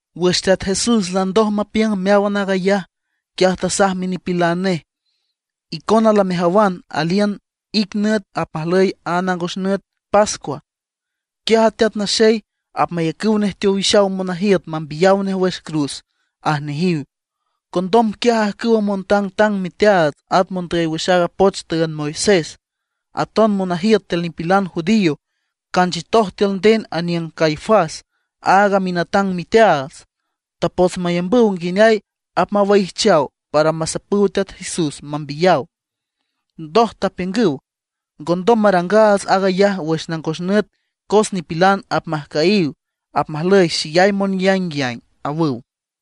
Wüx Teat Jesús landoj mapiüng meáwan aag ayaj, quiaj tasaj minipilan nej: ―Icona lamejawan aliün ic nüt apmajlüy a nangos nüt pascua. Quiaj a Teat Naxey, apmayacüw nej teowixaw monajiüt mambiyaw nej wüx cruz ―aj nejiw. Condom quiaj ajcüwa montangtang miteaats, at mondüy wüx aaga poch tüünd Moisés, aton monajiüt tiül nipilan judío canchiütoj tiül nden aniüng Caifás, aaga minatang miteaats. Tapots mayambüw nguineay apmawaijchaw para masapüw Teat Jesús mambiyaw. Ndoj tapiüngüw: ―Ngondom marangaats aag ayaj wüx nangos nüt cos nipilan apmajcüyiw, apmajlüy xeyay monyaingyaing ―awüw.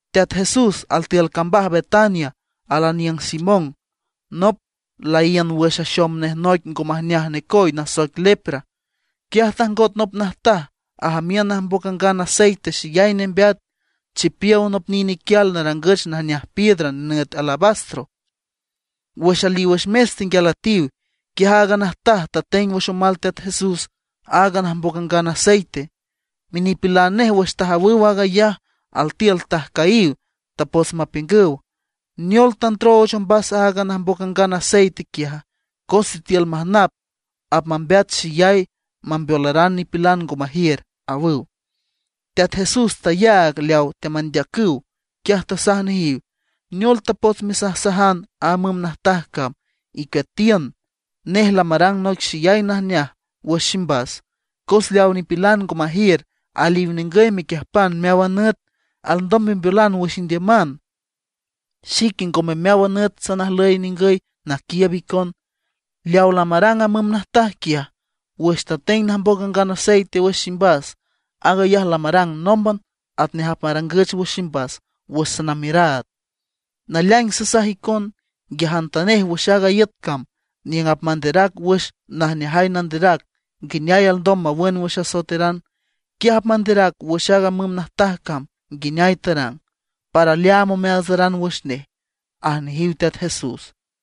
Teat Jesús altiül cambaj Betania alaniüng Simón, nop laíün wüx axom nej noic ngo majneaj necoy nasoic lepra. Quiaj tajngot nop najtaj ajamiün najmboc angan aceite xeyay nembeat, chipiow nop nine iquial narangüch najneaj piedra nenüt alabastro. Wüx aliw wüx mes tenguial üetiw, quiaj aaga najtaj tateng wüx omal Teat Jesús aaga najmboc angan aceite. Minipilan nej wüx tajawüw aag ayaj altiül tajcüyiw, tapots mapiüngüw: ―¿Neol tandrooch ombas aaga najmboc angan aceite quiaja? Cos sitiül majnap apmambeat xeyay, mambeolaran nipilan ngo majiür ―awüw. Teat Jesús tayaag leaw teamandeacüw, quiaj tasaj nejiw: ―¿Neol tapots mesajsajan a müm najtaj cama? Icueatiün; nej lamarang noic xeyay najneaj wüx ximbas. Cos leaw nipilan ngo majiür aliw ningüy mequiüjpan meáwan nüt, alndom membeolan wüx indiüman; xique ngome meáwan nüt sanajlüy ningüy naquiiüb icon. Leaw lamarang a müm najtaj quiaj, wüx tateng najmboc angan aceite wüx ximbas, aag ayaj lamarang nómban atnej apmarangüch wüx ximbas wüx sanamiüraad. Naleaing sasaj icon, nguiajantanej wüx aaga iüt cam niüng apmanderac wüx aaga najneajay nanderac nguineay alndom nawün wüx asoeteran, quiaj apmanderac wüx aaga müm najtaj cam nguineay tarang, para leaam omeaatsaran wüx nej ―aj nejiw Teat Jesús.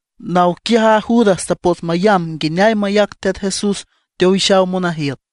Naw quiaj aaga Judas tapots mayamb nguineay mayac Teat Jesús teowixaw monajiüt.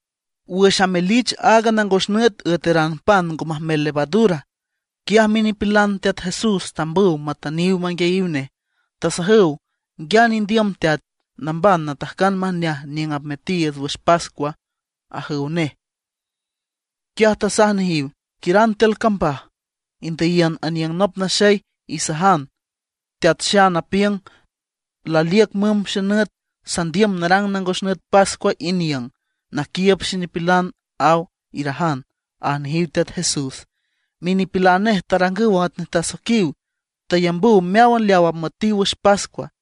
Wüx amelich aaga nangos nüt üeteran pan ngo majmel levadura, quiaj minipilan Teat Jesús tambüw matüniw manguiayiw nej, tasajüw: ―¿Nguiane indiüm teat, namban natajcan majneaj niüng apmetiiüts wüx pascua? ―ajüw nej. Quiaj tasaj nejiw: ―Quiüran tiül cambaj, indüyiün aniüng nop naxey, isajan: “Teat Xan apiüng: Laliüc mümb xenüt, sandiüm narang nangos nüt pascua iniüng, naquiiüb xenipilan, aw”, irajan ―aj nejiw Teat Jesús. Minipilan nej tarangüw atnej tasoiquiw, tayambüw meáwan leaw apmüetiw wüx pascua.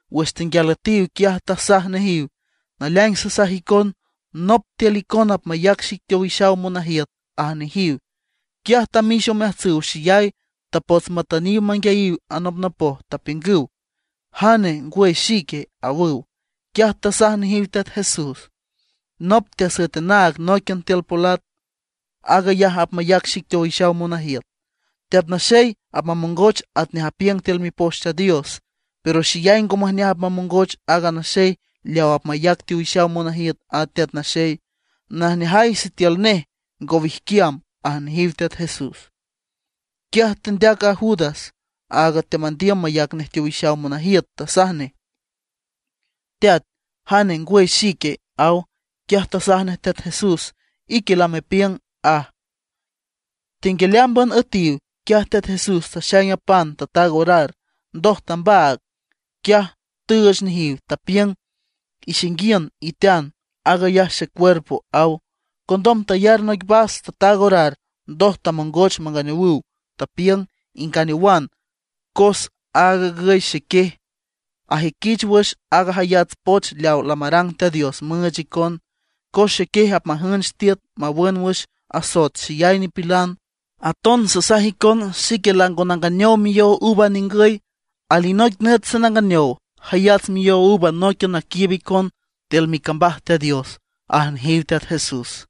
Wüx tenguial üetiw, quiaj tasaj nejiw: ―Naleaing sasaj icon, nop tiül icona apmayac xic teowixaw monajiüt ―aj nejiw. Quiaj tamix omeajtsüw xeyay, tapots matüniw manguiayiw anopnopoj, tapiüngüw: ―¿Jane, ngwüy xique? ―awüw. Quiaj tasaj nejiw Teat Jesús: ―Nop teasüet anaag nóiquian tiül polat, aag ayaj apmayac xic teowixaw monajiüt. Teat Naxey apmamongoch atnej apiüng tiül Mipoch Teat Dios; pero xeyay ngo majneaj apmamongoch aaga naxey leaw apmayac teowixaw monajiüt a Teat Naxey. Najneajay sitiül nej ngo wijquiam ―aj nejiw Teat Jesús. Quiaj tendeac a Judas, áag teamandiüm mayac nej teowixaw monajiüt, tasaj nej: ―Teat, ¿jane, ngwüy xique? ―aw. Quiaj tasaj nej Teat Jesús: ―Ique lamepiüng ―aj. Tenguial ámban üetiw, quiaj Teat Jesús taxaing a pan, tataag orar, ndoj tambaag, quiaj tüüch nejiw, tapiüng: ―Ixainguiün itean, cos aag ayaj xecuerpo ―aw. Condom tayar noic vas, tataag orar, ndoj tamongoch manganeowüw, tapiüng: ―Inganeowan. Cos aag agüy xequiej, ajüiquich wüx aaga jayats poch leaw lamarang Teat Dios müüch icon; cos xequiej apmajünch tiüt mawün wüx asoet xeyay nipilan. Aton sasaj icon xique lango nanganeow miyow uva ningüy; alinoic nüt sananganeow jayats miyow uva nóiquian naquiiüb icon tiül micambaj Teat Dios ―aj nejiw Teat Jesús.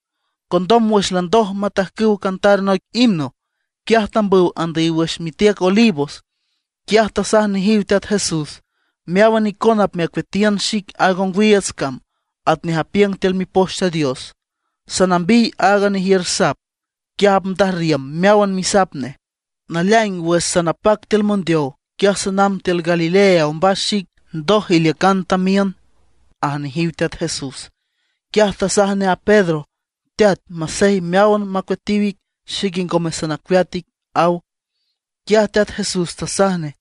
Condom wüx landoj matajcüw cantar noic himno, quiaj tambüw andüyiw wüx mitiüc Olivos. Quiaj tasaj nejiw Teat Jesús: ―Meáwan icona apmecueatiün xic aaga ongwiiüts cam, atnej apiüng tiül Mipoch Teat Dios: “Sanambiy aaga nejiür sap, quiaj apndajrriüm meáwan misap nej.” Naleaing wüx sanapac tiül mondeow, quiaj sanamb tiül Galilea ombas xic, ndoj iliücan tamiün ―aj nejiw Teat Jesús. Quiaj tasaj nej a Pedro: ―Teat, masey meáwan macueatiw ic, xique ngome sanacueat ic ―aw. Quiaj Teat Jesús tasaj nej: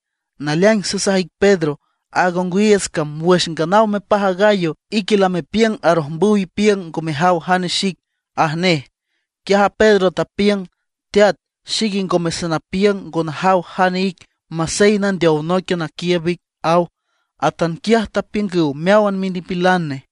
―Naleaing sasaj ic Pedro, aaga ongwiiüts cam wüx nganaw mepaj a gallo, ique lamepiüng arojmbüw ipiüng ngo mejaw jane xic ―aj nej. Quiaj a Pedro tapiüng: ―Teat, xique ngome sanapiüng ngo najaw jane ic masey nandeow nóiquian naquiiüb ic ―aw. Atanquiaj tapiüngüw meáwan minipilan nej.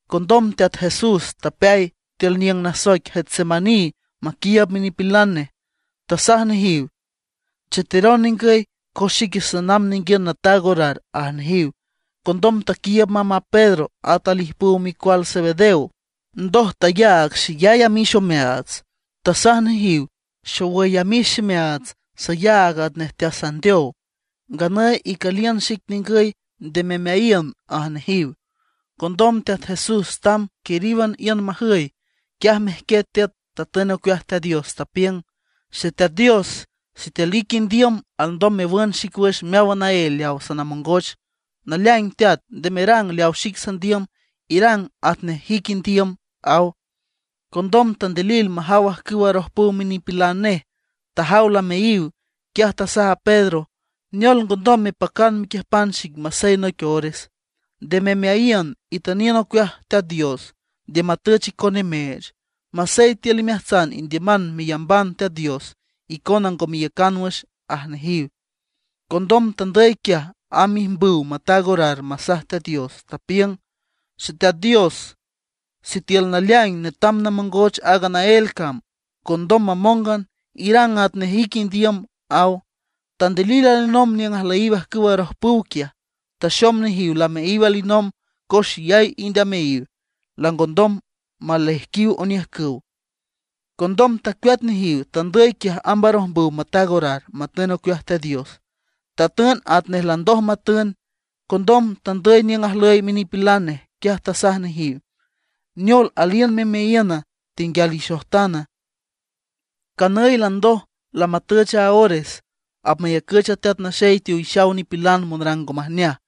Condom Teat Jesús tapeay tiül niüng nasoic Getsemaní maquiiüb minipilan nej. Tasaj nejiw: ―Cheteron ningüy, cos xique sanamb ninguiün nataag orar ―aj nejiw. Condom taquiiüb mamb a Pedro at alijpüw micual Zebedeo, ndoj tayaag xeyay amix omeaats. Tasaj nejiw: ―Xowüy amix ximeaats, sayaag atnej teasandeow. Nganüy icüliün xic ningüy, nde memeayiün ―aj nejiw. Condom Teat Jesús tamb quiríwan iün majüy, quiaj mejquiet tiüt, tatün ocueaj Teat Dios, tapiüng: ―Xeteat Dios, sitiül ique indiüm, alndom mewün xic wüx meáwan naél leaw sanamongoch. Naleaing Teat, nde merang leaw xic sandiüm, irang atnej ique indiüm ―aw. Condom tandilil majaw ajcüw arojpüw minipilan nej, tajaw lameayiw. Quiaj tasaj a Pedro: ―¿Neol, ngondom mepacana mequiüjpan xic masey noic ores? Nde memeayiün, itüniün ocueaj Teat Dios, nde matüch icon nimeech. Masey tiül imeajtsan indiüman meyamban Teat Dios, icona ngo meiücan wüx ―aj nejiw. Condom tandüy quiaj amb ijmbüw mataag orar masaj Teat Dios, tapiüng: ―Xeteat Dios, sitiül naleaing netam namongoch aaga naél cam, ngondom mamóngan, irang atnej ique indiüm ―aw. Tandilil alinomb niüng ajlüyiw ajcüw arojpüw quiaj. Taxom nejiw lameayiw alinomb, cos xeyay ind ameayiw, langondom maleaijquiw oniüjcüw. Condom tacueat nejiw, tandüy quiaj amb arojmbüw mataag orar, matün ocueaj Teat Dios, tatün atnej landoj matün. Condom tandüy niüng ajlüy minipilan nej, quiaj tasaj nejiw: ―¿Neol, aliün memeayiüna, tenguial ixojtana? Canüy landoj, lamatüch a ores. Apmayacüch a Teat Naxey teowixaw nipilan monrang ngo majneaj.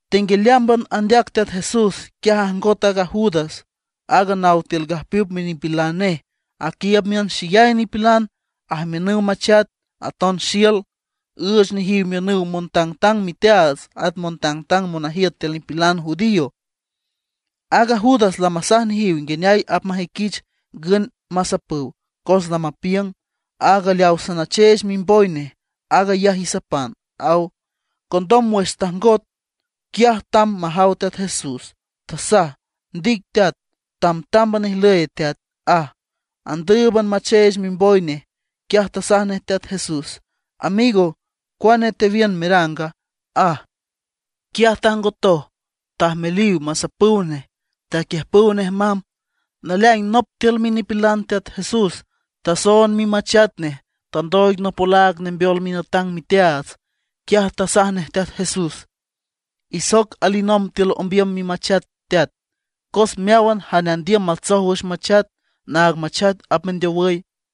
Tenguialeámban andeac Teat Jesús, quiaj ajngot a Judas, aaga naw tiül gajpiüp minipilan nej, aquiiüb miün xeyay nipilan, ajamiünüw machat, aton xiül. Üüch nejiw miünüw montangtang miteaats at montangtang monajiüt tiül nipilan judío. Aaga Judas lamasaj nejiw nguineay apmajüiquich ngün masapüw. Cos lamapiüng: ―Áag leaw sanacheech mimboy nej, aag ayaj isapan ―aw. Condom wüx tajngot, quiaj tamb majaw Teat Jesús, tasaj: ―Ndic Teat, tamtámban ijlüy teat ―aj. Andüüb macheech mimboy nej. Quiaj tasaj nej Teat Jesús: ―Amigo, ¿cuane tewiün meranga? ―aj. Quiaj tajngotoj, tajmeliw masapüw nej, taquiüjpüw nej mamb. Naleaing nop tiül minipilan Teat Jesús tasoond mimachat nej, tandooig nop olaag nembeol minatang miteaats. Quiaj tasaj nej Teat Jesús: ―Isoc alinomb tiül ombiüm mimachat, teat, cos meáwan jane andiüm matsoj wüx machat, naag machat apmendeowüy.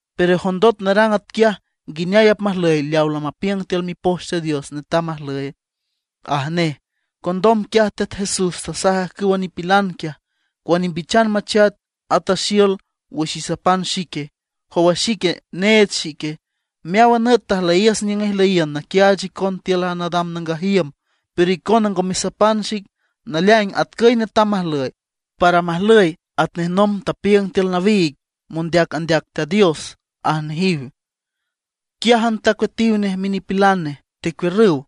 Pero jondot narang atquiaj, ¿nguineay apmajlüy leaw lamapiüng tiül Mipoch Teat Dios netam majlüy? ―aj nej. Condom quiaj Teat Jesús tasaj ajcüwa nipilan quiaj: ―¿Cuane imbichan machat, ata xiül wüx isapan xique? ¿Jow a xique, need xique? Meáwan nüt tajlüyiüs niüng ijlüyiün naquiaach icon tiül a nadam nangaj iüm, pero icona ngo mesapan xic. Naleaing atcüy netam majlüy, para majlüy atnej nomb tapiüngüw tiül nawiig mondeac andeac Teat Dios ―aj nejiw. Quiájan tacueatiw nej minipilan nej, tecuiürrüw.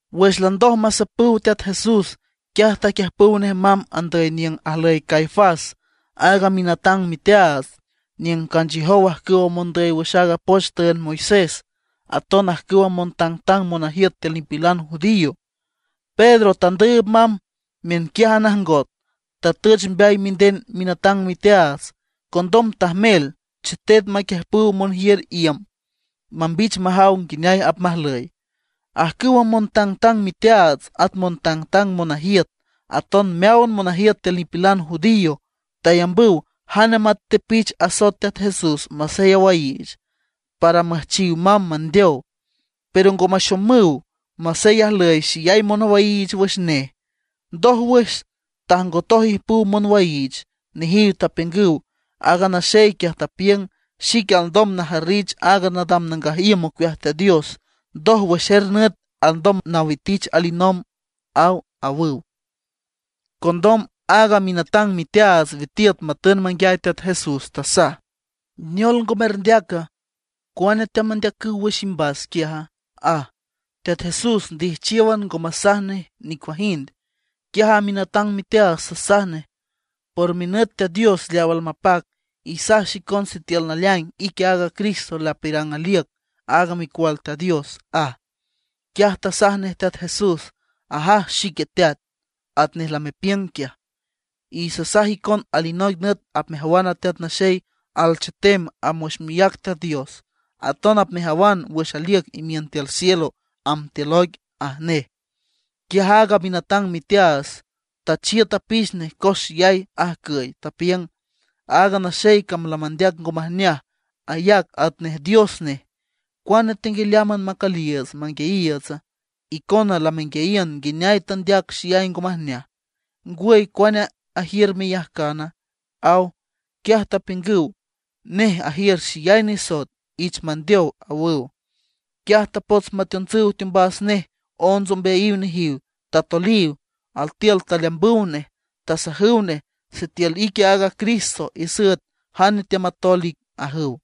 Wüx landoj masapüw Teat Jesús, quiaj taquiüjpüw nej mamb andüy niüng ajlüy Caifás, aaga minatang miteaats, niüng canchiüjow ajcüwa mondüy wüx aaga poch tüünd Moisés, aton ajcüwa montangtang monajiüt tiül nipilan judío. Pedro tandüüb mamb miünquiájan ajngot, tatüch mbeay minden minatang miteaats. Condom tajmel chetet maquiüjpüw monjiür iüm, mambich majaw nguineay apmajlüy. Ajcüwa montangtang miteaats, montangtang monajiüt, aton meáwan monajiüt tiül nipilan judío tayambüw jane matepich asoet Teat Jesús masey awaiich, para müjchiw mamb mandeow. Pero ngo maxomüw, masey ajlüy xeyay monwaiich wüx nej. Ndójwüx, tajngotoj ijpüw monwaiich. Nejiw tapiüngüw: ―Aaga naxey quiaj tapiüng: “Xique alndom najarrich aag nadam nangaj iüm ocueaj Teat Dios, ndoj wüx er nüt alndom nawitich alinomb”, aw ―awüw. Condom aaga minatang miteaats witiüt matün manguiay Teat Jesús, tasaj: ―¿Neol ngo merndeaca? ¿Cuane teamandeacüw wüx imbas quiaja? ―aj. Teat Jesús ndijchiówan, ngo masaj nej nicuajind. Quiaj a minatang miteaats tasaj nej: ―Por minüt Teat Dios leaw almapac, isaj xicon sitiül naleaing ique aaga Cristo lapiürang aliüc, aag Micual Teat Dios ―aj. Quiaj tasaj nej Teat Jesús: ―Ajaj xique teat, atnej lamepiüng quiaj; y sasaj icon alinoic nüt apmejawan a Teat Naxey alchetem amb wüx miác Teat Dios; aton apmejawan wüx aliüc imiün tiül cielo, amb tiül oic ―aj nej. Quiaj aaga minatang miteaats tachiüt apix nej cos xeyay ajcüy, tapiüng: ―Aaga naxey cam lamandeac ngo majneaj, ayac atnej Dios nej. ¿Cuane tenguialeámban macüliiüts manguiayiiütsa? Icona lamenguiayiün nguineay tandeac xeyay ngo majneaj. ¿Ngwüy, cuane ajiür meyajcana? ―aw. Quiaj tapiüngüw: ―¡Nej ajiür xeyay nisoet, ich mandeow! ―awüw. Quiaj tapots mateontsüw teombas nej onts ombeayiw nejiw, tatoliw, altiül taleambüw nej. Tasajüw nej: ―¡Sitiül ique aaga Cristo, isüet jane teamatol ic! ―ajüw.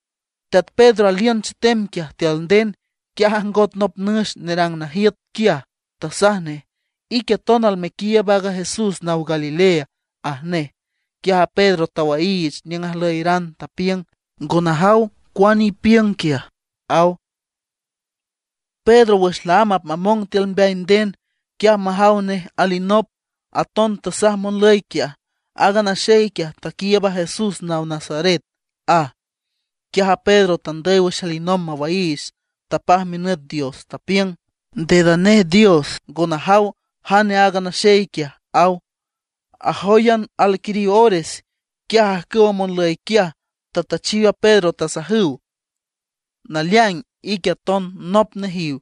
Teat Pedro aliün chetem quiaj tiül nden, quiaj ajngot nop nüx nerang najiüt quiaj, tasaj nej: ―Ique aton almequiiüb aaga Jesús naw Galilea ―aj nej. Quiaj a Pedro tawaiich niüng ajlüyaran, tapiüng: ―Ngo najaw cuane ipiüng quiaj ―aw. Pedro wüx laámb apmamong tiül ombeay nden, quiaj majaw nej alinop, aton tasaj monlüy quiaj: ―Aaga naxey quiaj taquiiüb aaga Jesús naw Nazaret ―aj. Quiaj a Pedro tandüy wüx alinomb mawaiich, tapaj minüt Dios, tapiüng: ―¡Deda nej dios, ngo najaw jane aaga naxey quiaj! ―aw. Ajóyan alquiriw ores, quiaj ajcüwa monlüy quiaj tatüchiw a Pedro, tasajüw: ―Naleaing ique aton nop nejiw,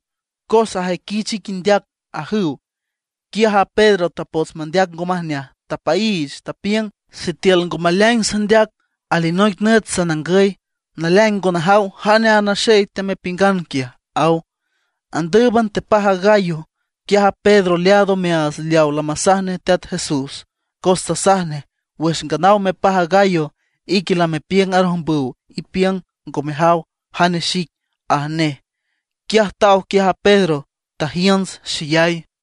cos ajüiquich ic indeac ―ajüw. Quiaj a Pedro tapots mandeac ngo majneaj, tapaiich, tapiüng: ―Sitiül ngo maleaing sandeac, alinoic nüt sanangüy. ¡Naleaing ngo najaw jane aaga naxey temepiüngan quiaj! ―aw. Andǘüban tepaj a gallo. Quiaj a Pedro leaad omeaats leawa lamasaj nej Teat Jesús, cos tasaj nej: “Wüx nganaw mepaj a gallo, ique lamepiüng arojmbüw ipiüng ngo mejaw jane xic”, aj nej. Quiaj taw quiaj a Pedro, tajiünts xeyay.